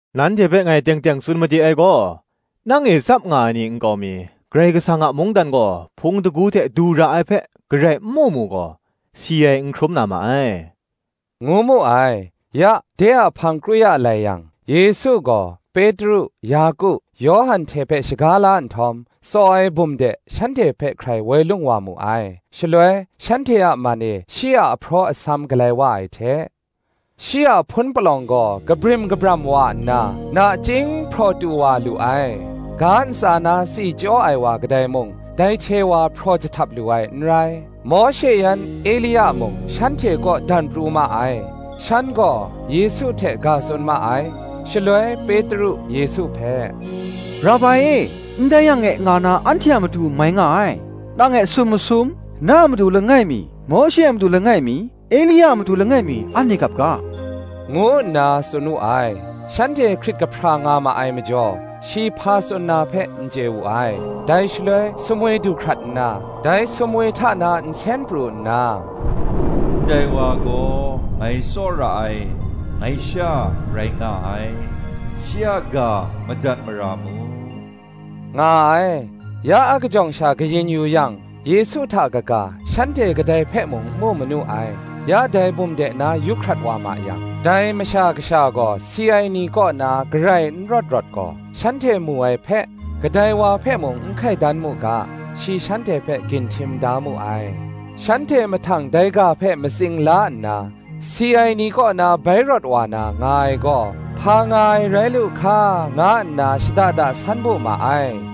Nanhte hpe ngai teng teng tsun made ai gaw, Nang e tsap nga ai ni nkau mi, Karai Kasang a mungdan gaw hpung shingkang hte du ra ai hpe, garai n mu mu gaw, si ai n hkrum na ma ai,” ngu mu ai. Ya, de a hpang kru ya lai yang, Yesu gaw, Petru, Yaku, Yawhan hte hpe shaga la nhtawm, tsaw ai bum de, shanhte hpe hkrai woi lung wa mu ai. Shaloi, shanhte a man e shi a ahpraw asam galai wa ai hte, shi a hpun palawng gaw kabrim kabram wa nna, nachying hpraw tu wa lu ai: ga ntsa na tsi chyaw ai wa kadai mung, dai hte wa hpraw jahtap lu ai n rai. Mawshe yan Elia mung shanhte kaw dan pru ma ai: shan gaw Yesu hte ga tsun ma ai. Shaloi Petru Yesu hpe, “Rabai e, ndai yang e nga na, anhte a matu mai nga ai: nang e sum masum, na a matu langai mi, Mawshe a matu langai mi, Elia a matu langai mi, anhte gap ga,” ngu nna tsun wu ai. Shanhte hkrit kahpra nga ma ai majaw, shi hpa tsun na hpe, n chye wu ai. Dai shaloi sumwi du hkrat nna, shanhte hpe ka-up nhtawm, dai sumwi hta na nsen pru nna, “Ndai wa gaw, ngai tsawra ai, ngai Sha rai nga ai: shi a ga madat mara mu,” nga ai. Ya akajawng sha kayin yu yang, Yesu hta kaga, shanhte kadai hpe mung n mu manu ai. Ya dai bum de na yu hkrat wa ma yang, dai Masha Kasha gaw si ai ni kaw na garai n rawt rawt gaw, shanhte mu ai hpe, kadai wa hpe mung n hkai dan mu ga, shi shanhte hpe ginhtim da mu ai. Shanhte mahtang dai ga hpe matsing la nna, “Si ai ni kaw na bai rawt wa na, nga ai gaw, hpa nga ai rai lu hka?” nga nna shada da san bu ma ai.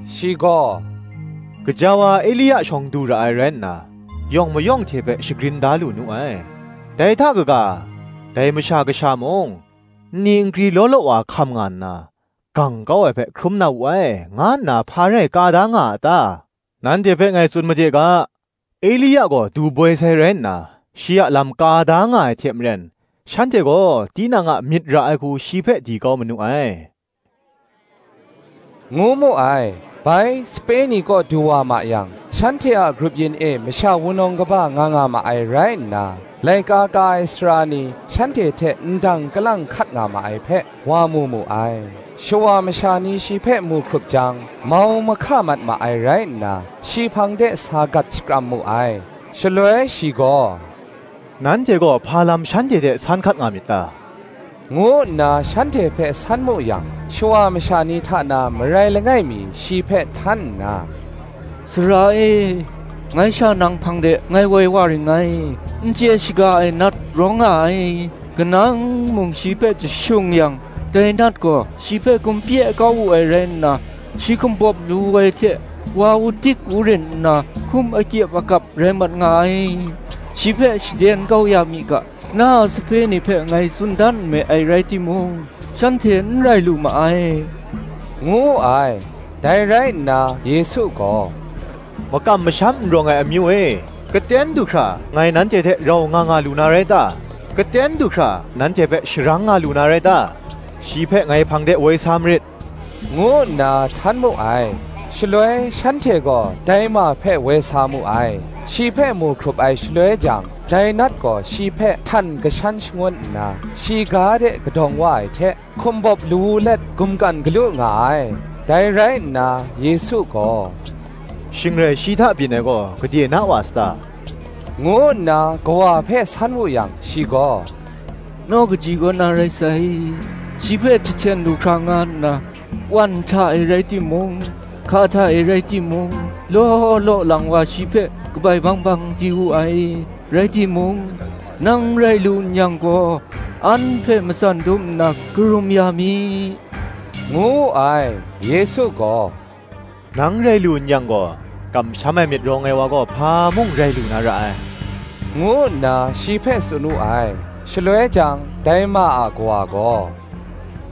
Shi gaw, “Gaja wa, Elia shawng du ra ai rai nna, yawng mayawng hte hpe shagrin da lu nu ai: dai hta kaga, dai Masha Kasha mung, nni nkri law law wa hkam nga nna, gang kau ai hpe hkrum na wu ai,” nga nna hpa rai ka da nga a ta? Nanhte hpe ngai tsun made ga, “Elia gaw du boi sai rai nna, shi a lam ka da nga ai hte maren, shanhte gaw tinang a myit ra ai hku shi hpe di kau manu ai,” ngu mu ai. Bai, sape ni kaw du wa ma yang, shanhte a grup yin e masha wunawng kaba nga nga ma ai rai nna, laika ka ai sara ni shanhte hte ndang kalang hkat nga ma ai hpe, wa mu mu ai. Shawa masha ni shi hpe mu hkrup jang, mau mahka mat ma ai rai nna, shi hpang de sa gat shakram mu ai. Shaloi shi gaw, “Nanhte gaw hpa lam shanhte hte san hkat nga myit ta?” ngu nna shanhte hpe san mu yang, Shawa masha ni hta na marai langai mi shi hpe htan nna, “Sara e, ngai sha nang hpang de ngai woi wa ring ngai; n chye shaga ai nat rawng nga ai: kanang mung shi hpe jashung yang, dai nat gaw shi hpe gumpye kau wu ai rai nna, shi hkumbawp lawu ai hte wa udik urin nna hkum akyip akap rai mat nga ai: shi hpe shaden kau ya mi ga, na a sape ni hpe ngai tsun dan nme ai rai timung, shanhte n rai lu ma ai,” ngu wu ai. Dai rai nna Yesu gaw, “Makam masham n rawng ai amyu e, gaten du hkra ngai nanhte hte rau nga nga lu na rai ta? gaten du hkra nanhte hpe sharang nga lu na rai ta? shi hpe ngai hpang de woi sa marit,” ngu nna htan mu ai. Shaloi shanhte gaw dai ma hpe woi sa mu ai. Shi hpe mu hkrup ai shaloi jang, dai nat gaw shi hpe htan kashan shangun nna, shi ga de kadawng wa ai hte, hkumbawp lawu let gumkan galu nga ai. Dai rai nna, Yesu gaw, “Shing rai shi hta byin ai gaw, gade na wa sata?” ngu nna kawa hpe san wu yang, shi gaw, “Naw kaji kaw nna rai sai: shi hpe jahten lu hkra nga nna, wan hta e rai timung, hka hta e rai timung, law law lang wa shi hpe kabai bang bang di wu ai: rai timung, nang rai lu n-yang gaw, an hpe matsan dum nna karum ya mi,” ngu wu ai. Yesu gaw, “Nang rai lu n-yang gaw!- Kamsham ai myit rawng ai wa gaw hpa mung rai lu na ra ai,” ngu nna shi hpe tsun wu ai. Shaloi jang, dai ma a kawa gaw,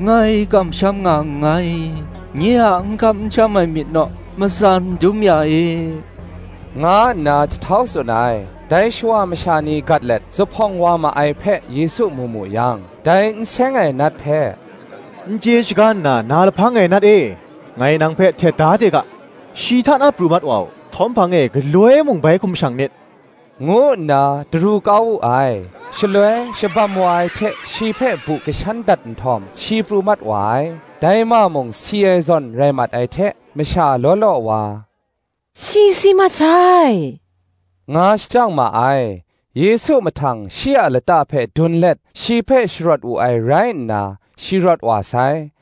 “Ngai kamsham nga nngai, nye a n kam n sham ai myit naw matsan dum ya e,” nga nna jahtau tsun ai. Dai shawa masha ni gat let zuphpawng wa ma ai hpe Yesu mu wu yang, dai n seng ai nat hpe, “N chye shaga nna na lahpang ai nat e, ngai nang hpe htet da de ga, shi hta na pru mat wa u; htawm hpang e galoi mung bai hkum shang nit,” ngu nna daru kau wu ai. Shaloi, shabam wa ai hte shi hpe bu kashan dat nhtawm, shi pru mat wa ai: dai ma mung si ai zawn rai mat ai hte, masha law law wa, “Shi si mat sai,” nga shajang ma ai. Yesu mahtang shi a lata hpe dun let, shi hpe sharawt wu ai rai nna, shi rawt wa sai.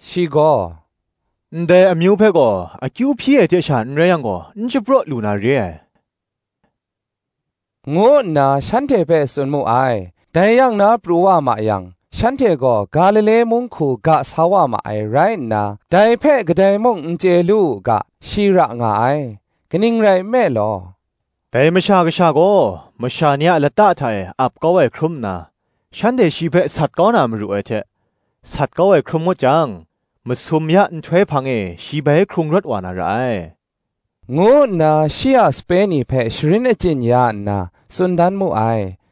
Shi gaw, “Ndai amyu hpe gaw, akyu hpyi ai hte sha n rai yang gaw, n shapraw lu na re ai,” ngu nna shanhte hpe tsun mu ai. Dai yang na pru wa ma yang, shanhte gaw Galile mung hku ga sa wa ma ai rai nna, dai hpe kadai mung n chye lu u ga, shi ra nga ai. Kaning rai nme law, “Dai Masha Kasha gaw masha ni a lata hta e ap kau ai hkrum nna, shanhte shi hpe sat kau na maru ai hte, sat kau ai hkrum ngut jang, masum ya nhtoi hpang e, shi bai hkrung rawt wa na ra ai,” ngu nna shi a sape ni hpe sharin achyin ya nna, tsun dan mu ai.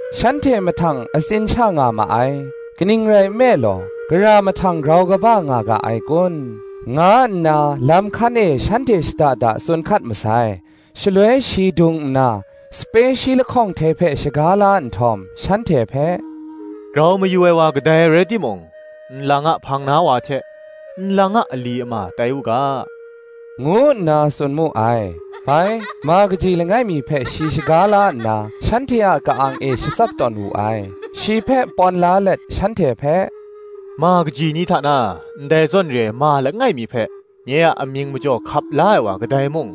Shanhte mahtang atsin sha nga ma ai: kaning rai nme law, “Gara mahtang grau kaba nga ga ai kun?” nga nna, lam hkan e shanhte shada da tsun hkat masai. Shaloi shi dung nna, sape shi lahkawng hte hpe shaga la nhtawm, shanhte hpe, “Grau mayu ai wa kadai rai timung, nlang a hpang na wa hte, nlang a ali ama tai u ga,” ngu nna tsun mu ai. Bai, ma kaji langai mi hpe shi shaga la nna, shanhte a ka-ang e shatsap tawn wu ai; shi hpe pawn la let shanhte hpe, “Ma kaji ni hta na, ndai zawn re ai ma langai mi hpe, nye a amying majaw hkap la ai wa kadai mung,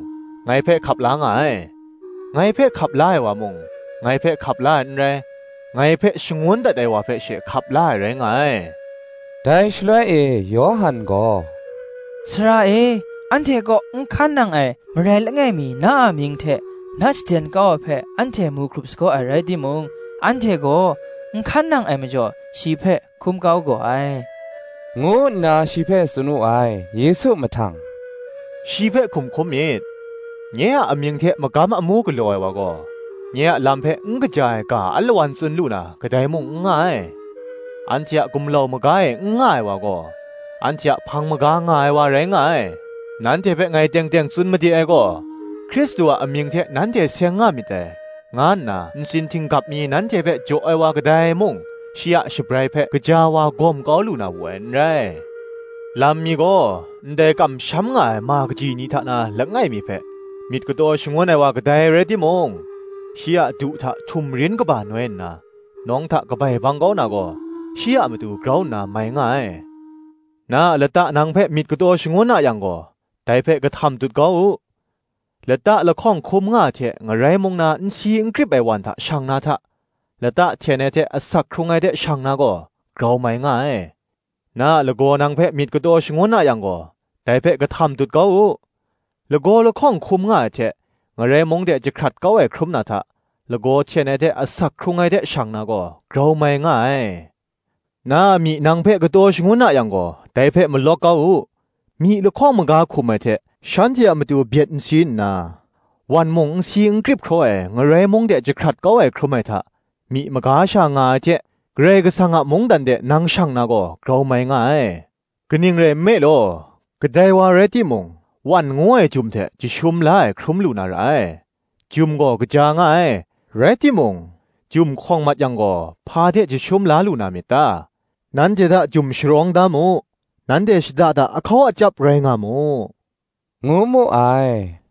ngai hpe hkap la nga ai: ngai hpe hkap la ai wa mung, ngai hpe hkap la ai n rai, ngai hpe shangun dat ai wa hpe she hkap la ai rai nga ai.” Dai shaloi e Yawhan gaw, “Sara e, anhte kaw n hkan nang ai marai langai mi na a amying hte nat shaden kau ai hpe anhte mu hkrup sagaw ai rai timung, anhte gaw n hkan nang ai majaw, shi hpe hkum kau gaw ai,” ngu nna shi hpe tsun wu ai. Yesu mahtang, “Shi hpe hkum hkum myit: nye a amying hte magam amu galaw ai wa gaw, nye a lam hpe n kaja ai ga alawan tsun lu na, kadai mung n nga ai: anhte a gumlau maga e n nga ai wa gaw, anhte a hpang maga nga ai wa rai nga ai. Nanhte hpe ngai teng teng tsun made ai gaw, Hkristu a amying hte nanhte seng nga myit dai, nga nna ntsin htinggap mi nanhte hpe jaw ai wa kadai mung, shi a shabrai hpe gaja wa gawm kaw lu na wu ai n rai. Lam mi gaw, Ndai kamsham nga ai ma kaji ni hta na langai mi hpe, myit kataw shangun ai wa kadai rai timung, shi a du hta htumrin kaba noi nna, nawng hta kabai bang kau na gaw, shi a matu grau nna mai nga ai. Na a lata nang hpe myit kataw shagun a yang gaw, dai hpe kahtam dut kau u: lata lahkawng hkum nga ai hte ngarai mung na n si n krip ai wan hta shang na hta, lata hten ai hte asak hkrung ai de shang na gaw, grau mai nga ai. Na a lagaw nang hpe myit kataw shangun a yang gaw, dai hpe kahtam dut kau u: lagaw lahkawng hkum nga ai hte, ngarai mung de jahkrat kau ai hkrum na hta, lagaw hten ai hte asak hkrung ai de shang na gaw, grau mai nga ai. Na a myi nang hpe kataw shangun a yang gaw, dai hpe malawk kau u: myi lahkawng maga hkum ai hte, shanhte a matu byet n si nna, wan mung n si n krip hkraw ai, ngarai mung de jahkrat kau ai hkrum ai hta, myi maga sha nga ai hte, Karai Kasang a mungdan de nang shang na gaw, grau mai nga ai. Kaning rai nme law, kadai wa rai timung, wan ngu ai jum hte jashum la ai hkrum lu na ra ai: Jum gaw kaja nga ai: rai timung, jum hkawng mat yang gaw, hpa hte jashum la lu na myit ta? Nanhte hta jum sharawng da mu: nanhte shada da ahkau achyap rai nga mu,” ngu mu ai.